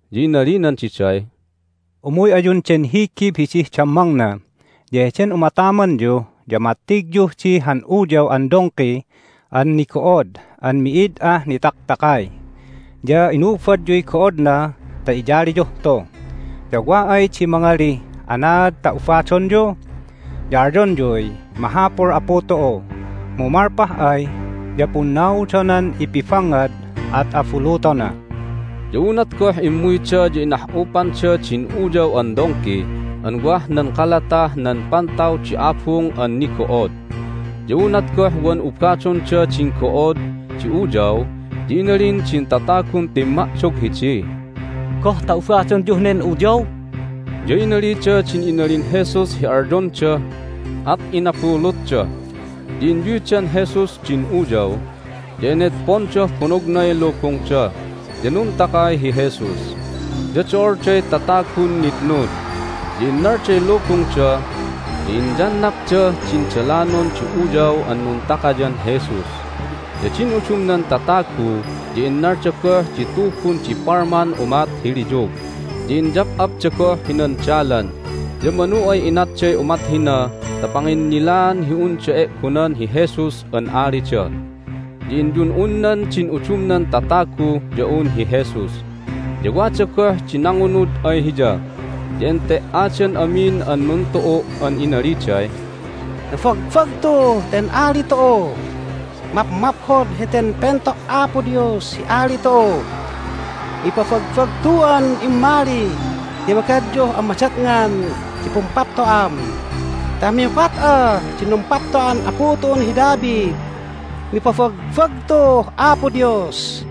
ya inalinan diday, "Umuy ayun den higib hidih dammangna, ya heden umatamanyu ya mattigyuh di han uyaw an dongki an nigo'od an mi'id ah nitaktakay, ya inubadyuy go'odna ta iyaliyuh tu. Ya wa ay di mangalih, Anaad ta ubadonyu? ya alyonyuy, Mahapul Apu tu'u, mu malpah ay ya punnaudonan ipibangngad. At abulutona." Ya unat goh immuyda ya inah'upanda din uyaw an dongki an wah nan kalatah nan pantaw di abung an nigo'od. Ya unat goh wan ubadonda din go'od di uyaw ya inalin din tatagun timma'dog hidiy, "Goh ta ubadonyuh nen uyaw?" Ya inalida din inalin Jesus hi alyonda, at inabulutda. Ya inyuydan Jesus din uyaw, ya enedpondah bonognay lubungda, ya nuntakay hi Jesus. Ya do'olday tatagun nitnud, ya innalday lubungda, ya inyannapdah din dalanon di uyaw an nuntakayan Jesus. Ya din udumnan tatagu ya innalda goh di tubun di palman umat hi liyug, ya inyap'apda goh hinan dalan. Ya manu ay inatday umat hina ta panginnilaan hi unda e'gonan hi Jesus an alida. Ya inyun'unnan din udumnan tatagu ya un hi Jesus, ya wada goh di nangunud ay Hiya. Ya ente"adan amin an nuntu'u' an inaliday, "Nabagbagtuh ten ali tu'u! Mapmaphod heten Pento' Apo Dios hi ali tu'u! Mipabagbagtu'an immali ti magadyuh an madatngan di pumpapto'am ta mihukat'ah din numpapto'an apu tu'un hi David! Mipabagbagtuh Apo Dios!"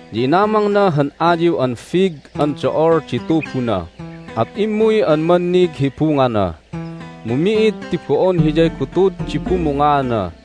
Ya inamangna han ayiw an fig an do'ol di tubuna, at immuy an mannig hi bungana, mu mi'id ti bo'on hiyay gutud di bumungaana.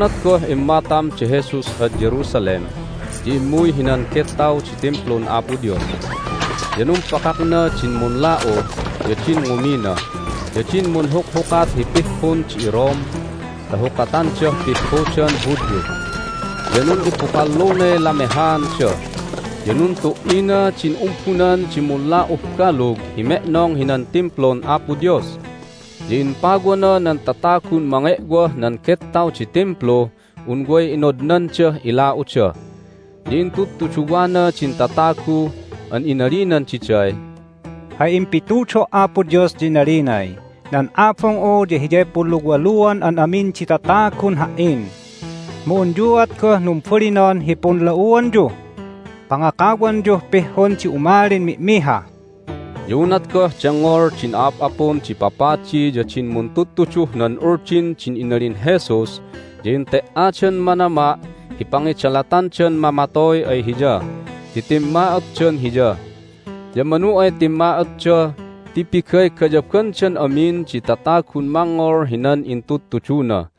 Unat goh immatam da Jesus ad Jerusalem ya immuy hinan gettaw di Timplun Apo Dios. Ya numpakakna din munla'u, ya din ngumina, ya din munhukhukat hi pihhun di iRome ta hukatandah pihhudan Hudyu, ya nun'ibukallunay lamehaanda, ya nuntu"ina din umbunan di munla'uh balug hi me'nong hinan Timplun Apo Dios, ya impawana nan tatagun mange'wah nan gettaw di Timpluh un way inodnandah ila'uda. Ya intudtuduwana din tatagu an inalinan diday, "Hay impitudo' Apo Dios ya inalinay, Nan Abung'u ya hiyay punluwaluan an amin di tatagun Ha"in. Mu unyuat goh numbalinon hi punla'uanyuh pangakawanyuh pihhun di umalin mi'miha!" Ya unat goh dengngol din a'ap'apun di papadi ya din muntudtuduh nan Uldin din inalin Jesus ya ente"adan manama' hi pangidalatandan mamatoy ay Hiya ti timma'otdan Hiya. Ya manu ay timma'otda ti pigaygayabandan amin di tatagun mangngol hinan intudtuduna.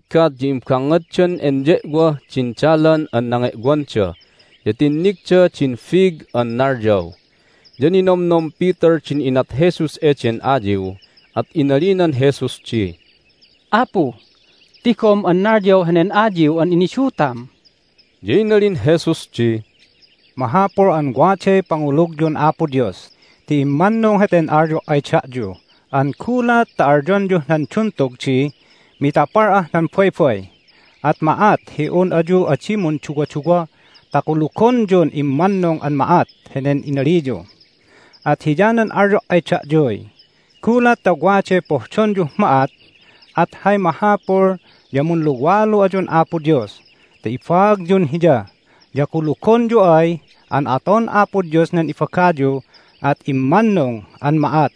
Unat goh nabiggat ya imbangngaddan enye'wah din dalan an nange'wanda, ya tinnigda din fig an nalyaw. Ya ninomnom Peter din inat Jesus eden ayiw, at inalinan Jesus di, "Apu, tigom an nalyaw henen ayiw an inidutam!" Ya inalin Jesus di, "Mahapul an waday pangulugyun Apo Dios ti immannung heten alyo' ay da'yu an gulat ta alyonyuh nan duntug di, Mitapal'ah nan baybay! at ma'at hi un ayu adi munduwaduwa ta kulugonyun immannung an ma'at henen inaliyu. At hiyanan alyo' ay da'yuy, Gulat ta waday pohdonyuh ma'at at hay mahapul ya munluwalu ayun Apo Dios ta ibaagyun Hiya, ya kulugonyu ay an aton Apo Dios nan ibagayu at immannung an ma'at.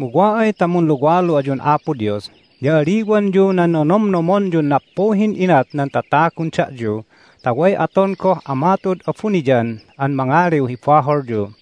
Mu wa ay ta munluwalu ayun Apo Dios ya aliwanyu nan nonomnomonyun nappuhin inat nan tatagun da'yu ta way aton goh Ama tu'ud abuniyan an mangaliw hi baholyu.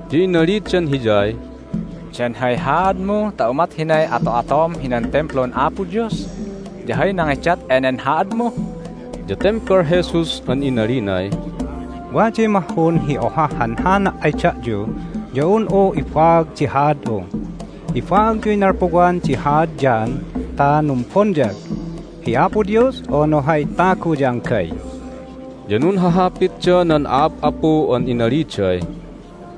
ya inalidan Hiyay, "Dan hay haadmu ta umat hinay ato'atom hinan Timplun Apo Dios? Ya hay nangidat enen haadmu?" Ya tembal Jesus an inalinay, "Waday mahhun hi ohah hanhana' ay da'yu ya un'u ibaag di haad'u. Ibaagyuy nalpuwan di haad John ta numbonyag---hi Apo Dios, unu hay tagu ya anggay?" Ya nunhahapitda nan a'ap'apu an inaliday,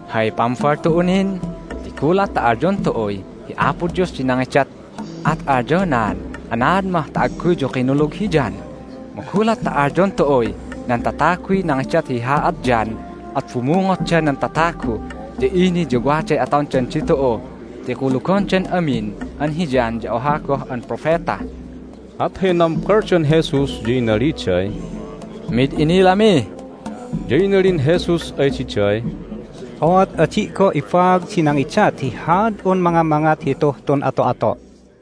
"Hay pambal tu'u nin? Ti gulat ta alyon tu'uy, Hi Apo Dios di nangidat, at alyonaan, Anaad mah ta agguyyu kinulug hi John? Mu gulat ta alyon tu'uy, Nan tataguy nangidat hi haad John, at bumungotda nan tatagu, ya ini ya waday atondan ditu'u ti kulugondan amin an hi John ya oha goh an propeta!" At hay nambaldan Jesus, ya inaliday, "Mid inilami." Ya inalin Jesus ay diday, "Ooat adi' goh ibaag di nangidat hi haad'un mangamangat hituh tun ato'ato'."